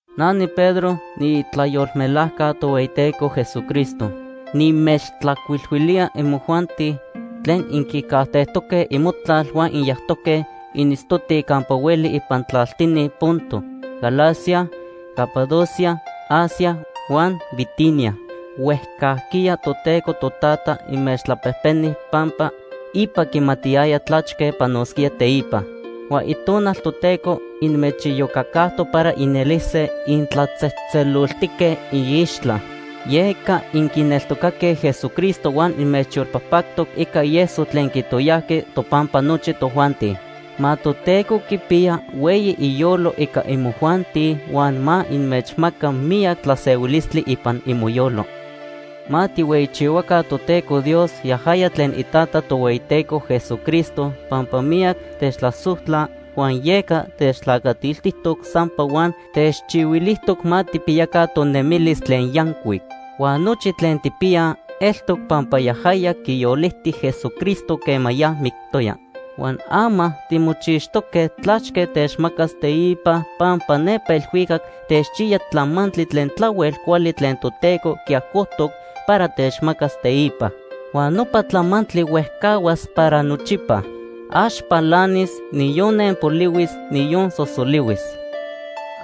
Na niPedro niitlayolmelajca Tohueyiteco Jesucristo. Nimechtlajcuilhuilía imojuanti tlen inquicajtejtoque imotlal huan inyajtoque initztotij campa hueli ipan tlaltini Ponto, Galacia, Capadocia, Asia huan Bitinia. Huejcajquiya Toteco Totata inmechtlapejpeni pampa ipa quimatiyaya tlachque panosquía teipa. Huan Itonal Toteco inmechiyocacajtoc para inelise intlatzejtzeloltique iixtla. Yeca inquineltocatoque Jesucristo huan inmechyolpajpactoc ica ieso tlen quitoyajqui topampa nochi tojuanti. Ma Toteco quipiya hueyi iyolo ica imojuanti huan ma inmechmaca miyac tlasehuilistli ipan imoyolo. Ma tijhueyichihuaca Toteco Dios yajaya tlen iTata Tohueyiteco Jesucristo pampa miyac techtlasojtla, huan yeca techtlacatiltijtoc sampa huan techchihuilijtoc ma tijpiyaca tonemilis tlen yancuic. Huan nochi tlen tijpiyaj eltoc pampa yajaya quiyoliti Jesucristo quema ya mictoya. Huan ama timochixtoque tlachque techmacas teipa, pampa nepa elhuicac techchiya tlamantli tlen tlahuel cuali tlen Toteco quiajcojtoc para techmacas teipa. Huan nopa tlamantli huejcahuas para nochipa. Ax palanis, niyon nenpolihuis, niyon sosolihuis.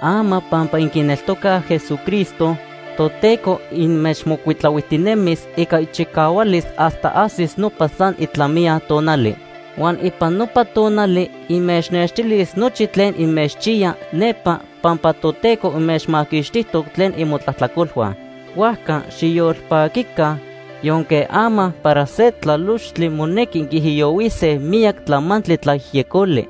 Ama pampa inquineltocaj Jesucristo, Toteco inmechmocuitlahuijtinemis ica ichicahualis hasta ajsis nopa san itlamiya tonali. Huan ipan nopa tonali inmechnextilis nochi tlen inmechchiya nepa pampa Toteco inmechmaquixtijtoc tlen imotlajtlacolhua. Huajca xiyolpaquica, yonque ama para se tlalochtli monequi inquiijiyohuise miyac tlamantli tlayejyecoli.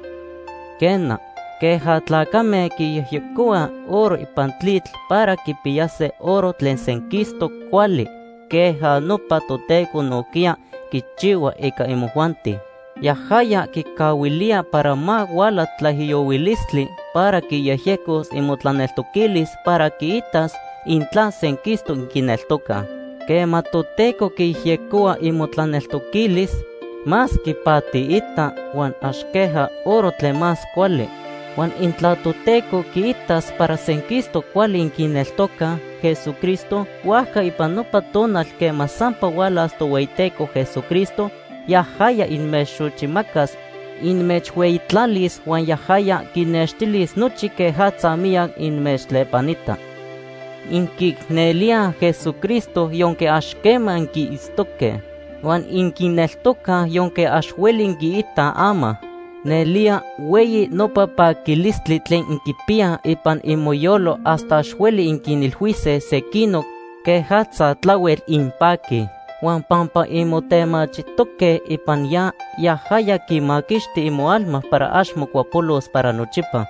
Quena, queja tlacame quiyejyecohuaj oro ipan tlitl para quipiyase oro tlen senquistoc cuali, queja nopa Toteco nojquiya quichihua ica imojuanti. Yajaya quicahuilía para ma huala tlaijiyohuilistli para quiyejyecos imotlaneltoquilis para quiitas intla senquistoc inquineltocaj. Quema Toteco quiyejyecohua imotlaneltoquilis, más quipatiita huan ax queja oro tlen más cuali. Huan intla Toteco quiitas para senquistoc cuali inquineltocaj Jesucristo, huajca ipan nopa tonal quema sampa hualas Tohueyiteco Jesucristo yajaya inmechxochimacas, inmechhueyitlalis huan yajaya quinnextilis nochi quejatza miyac inmechtlepanita. Inquiicnelíaj Jesucristo yonque ax quema inquiitztoque. Huan inquineltocaj yonque ax hueli inquiitaj ama. Nelía hueyi nopa paquilistli tlen inquipiyaj ipan imoyolo hasta ax hueli inquinilhuise sequinoc quejatza tlahuel inpaquij. Huan pampa inmotemachijtoque ipan ya, yajaya quimaquixti imoalma para ax mocuapolos para nochipa.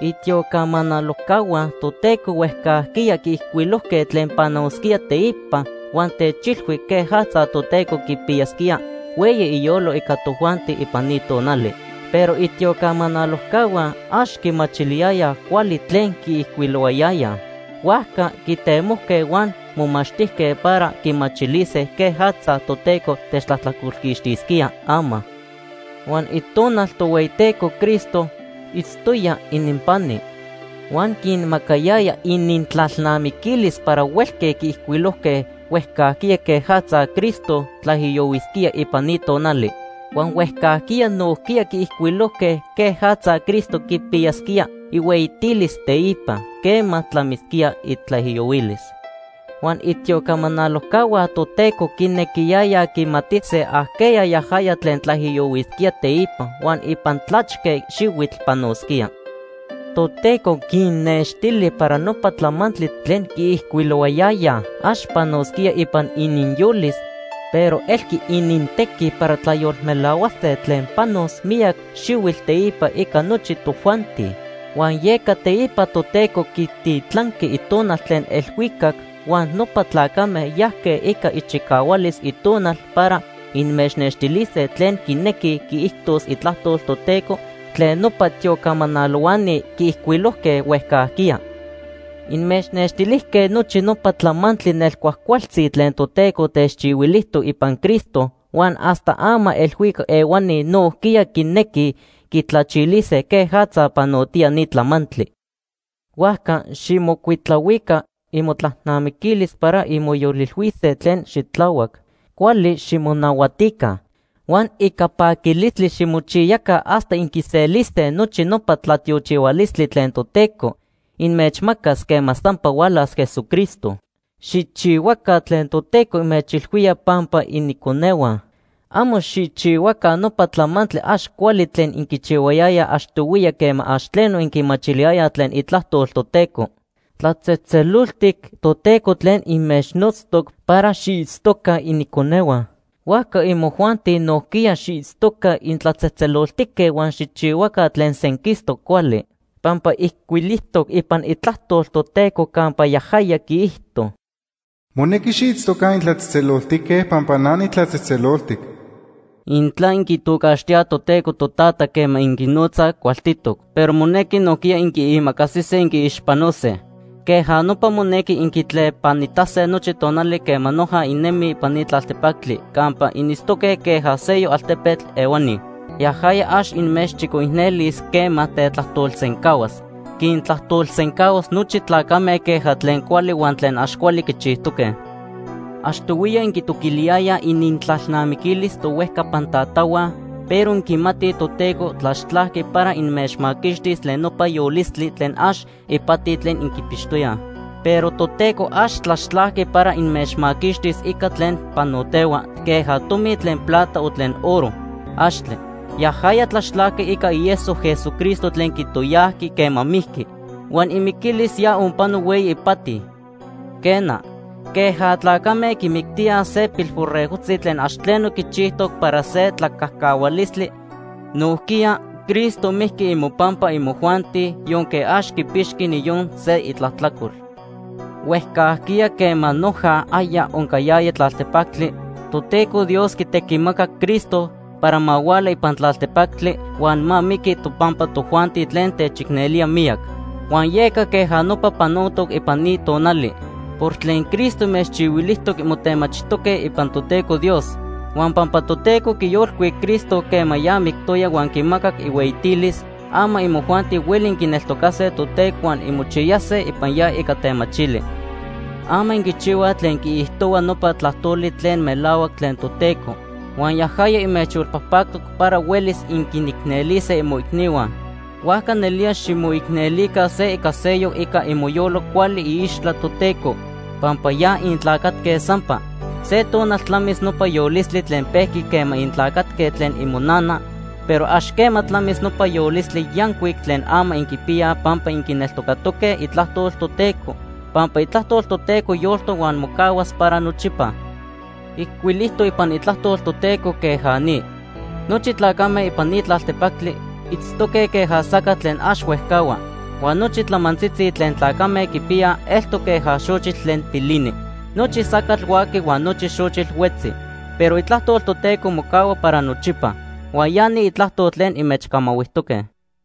Itiocamanalojcahua Toteco huejcajquiya quiijcuilojque tlen panosquía teipa huan techilhui quejatza Toteco quipiyasquía hueyi iyolo ica tojuanti ipan ni tonali. Pero itiocamanalojcahua ax quimachiliyayaj cuali tlen quiijcuilohuayayaj. Huajca quitemojque huan momachtijque para quimachilise quejatza Toteco techtlajtlacolquixtisquía ama. Huan Itonal Tohueyiteco Cristo itztoya ininpani, huan quinmacayaya inintlalnamiquilis para huelque quiijcuilojque huejcajquiya quejatza Cristo tlaijiyohuisquía ipan ni tonali. Huan huejcajquiya nojquiya quiijcuilojque quejatza Cristo quipiyasquía ihueyitilis teipa, quema tlamisquía itlaijiyohuilis. Huan itiocamanalojcahua Toteco quinequiyayaj quimatise ajqueya yajaya tlen tlaijiyohuisquía teipa huan ipan tlachque xihuitl panosquía. Toteco quinnextili para nopa tlamantli tlen quiijcuilohuayayaj ax panosquía ipan ininyolis, pero elqui inintequi para tlayolmelahuase tlen panos miyac xihuitl teipa ica nochi tojuanti. Huan yeca teipa Toteco quititlanqui Itonal tlen elhuicac, huan nopa tlacame yajque ica ichicahualis Itonal para inmechnextilise tlen quinequi quiijtos Itlajtol Toteco tlen nopa tiocamanalohuani quiijcuilojque huejcajquiya. Inmechnextilijque nochi nopa tlamantli nelcuajcualtzi tlen Toteco techchihuilijtoc ipan Cristo huan hasta ama elhuicac ehuani nojquiya quinequij quitlachilise quejatza panotiya ni tlamantli. Huajca xijmocuitlahuica imotlalnamiquilis para inmoyolilhuise tlen xitlahuac. Cuali ximonahuatica. Huan ica paquilistli ximochiyaca hasta inquiselise nochi nopa tlatiochihualistli tlen Toteco inmechmacas quema sampa hualas Jesucristo. Xijchihuaca tlen Toteco inmechilhuía pampa iniconehua. Amo xijchihuaca nopa tlamantli ax cuali tlen inquichihuayayaj achtohuiya quema ax tleno inquimachiliyayaj tlen itlajtol Toteco. Tlatzejtzeloltic Toteco tlen inmechnotztoc para xiitztoca iniconehua; huajca imojuanti nojquiya xiitztoca intlatzejtzeloltique huan xijchihuaca tlen senquistoc cuali. Pampa ijcuilijtoc ipan Itlajtol Toteco campa yajaya quiijto: “Monequi xiitztoca intlatzejtzeloltique pampa na nitlatzejtzeloltic.” Intla inquitocaxtíaj Toteco “Totata” quema inquinotzaj, cualtitoc, pero monequi nojquiya inquiimacasise inquiixpanose. Queja nopa monequi inquitlepanitase nochi tonali quema noja innemij ipan ni tlaltepactli campa initztoque queja seyoc altepetl ehuani. Yajaya ax inmechchicoicnelis quema tetlajtolsencahuas. Quintlajtolsencahuas nochi tlacame queja tlen cuali huan tlen ax cuali quichijtoque. Achtohuiya inquitoquiliyayaj inintlalnamiquilis tohuejcapan tatahua, pero inquimatij Toteco tlaxtlajqui para inmechmaquixtis tlen nopa yolistli tlen ax ipati tlen inquipixtoyaj. Pero Toteco ax tlaxtlajqui para inmechmaquixtis ica tlen panotehua queja tomi tlen plata o tlen oro. ¡Axtle! Yajaya tlaxtlajqui ica ieso Jesucristo tlen quitoyajqui quema mijqui. Huan imiquilis ya onpano hueyi ipati. Quena, queja tlacame quimictíaj se pilborregojtzi tlen ax tleno quichijtoc para se tlacajcahualistli, nojquiya Cristo mijqui imopampa imojuanti yonque ax quipixqui niyon se itlajtlacol. Huejcajquiya quema noja aya oncayaya tlaltepactli, Toteco Dios quitequimacac Cristo para ma huala ipan tlaltepactli huan ma miqui topampa tojuanti tlen techicnelía miyac. Huan yeca queja nopa panotoc ipan ni tonali. Por tlen Cristo inmechchihuilijtoc, inmotemachijtoque ipan Toteco Dios. Huan pampa Toteco quiyolcuic Cristo quema ya mictoya huan quimacac ihueyitilis, ama imojuanti hueli inquineltocase Toteco huan inmochiyase ipan ya ica temachili. Ama inquichihuaj tlen quiijtohua nopa tlajtoli tlen melahuac tlen Toteco, huan yajaya inmechyolpajpactoc para huelis inquinicnelise imoicnihua. Huajca nelía ximoicnelica se ica seyoc ica imoyolo cuali iixtla Toteco, pampa ya intlacatque sampa. Se tonal tlamis nopa yolistli tlen pejqui quema intlacatque tlen imonana, pero ax quema tlamis nopa yolistli yancuic tlen ama inquipiyaj pampa inquineltocatoque Itlajtol Toteco, pampa Itlajtol Toteco yoltoc huan mocahuas para nochipa. Ijcuilijtoc ipan Itlajtol Toteco queja ni: “Nochi tlacame ipan ni tlaltepactli itztoque queja sacatl tlen ax huejcahua. Huan nochi tlamantzitzi tlen tlacame quipiyaj eltoc queja xochitl tlen pilinij. Nochi sacatl huaqui huan nochi xochitl huetzi, pero Itlajtol Toteco mocahua para nochipa.” Huan ya ni Itlajtol tlen inmechcamahuijtoque.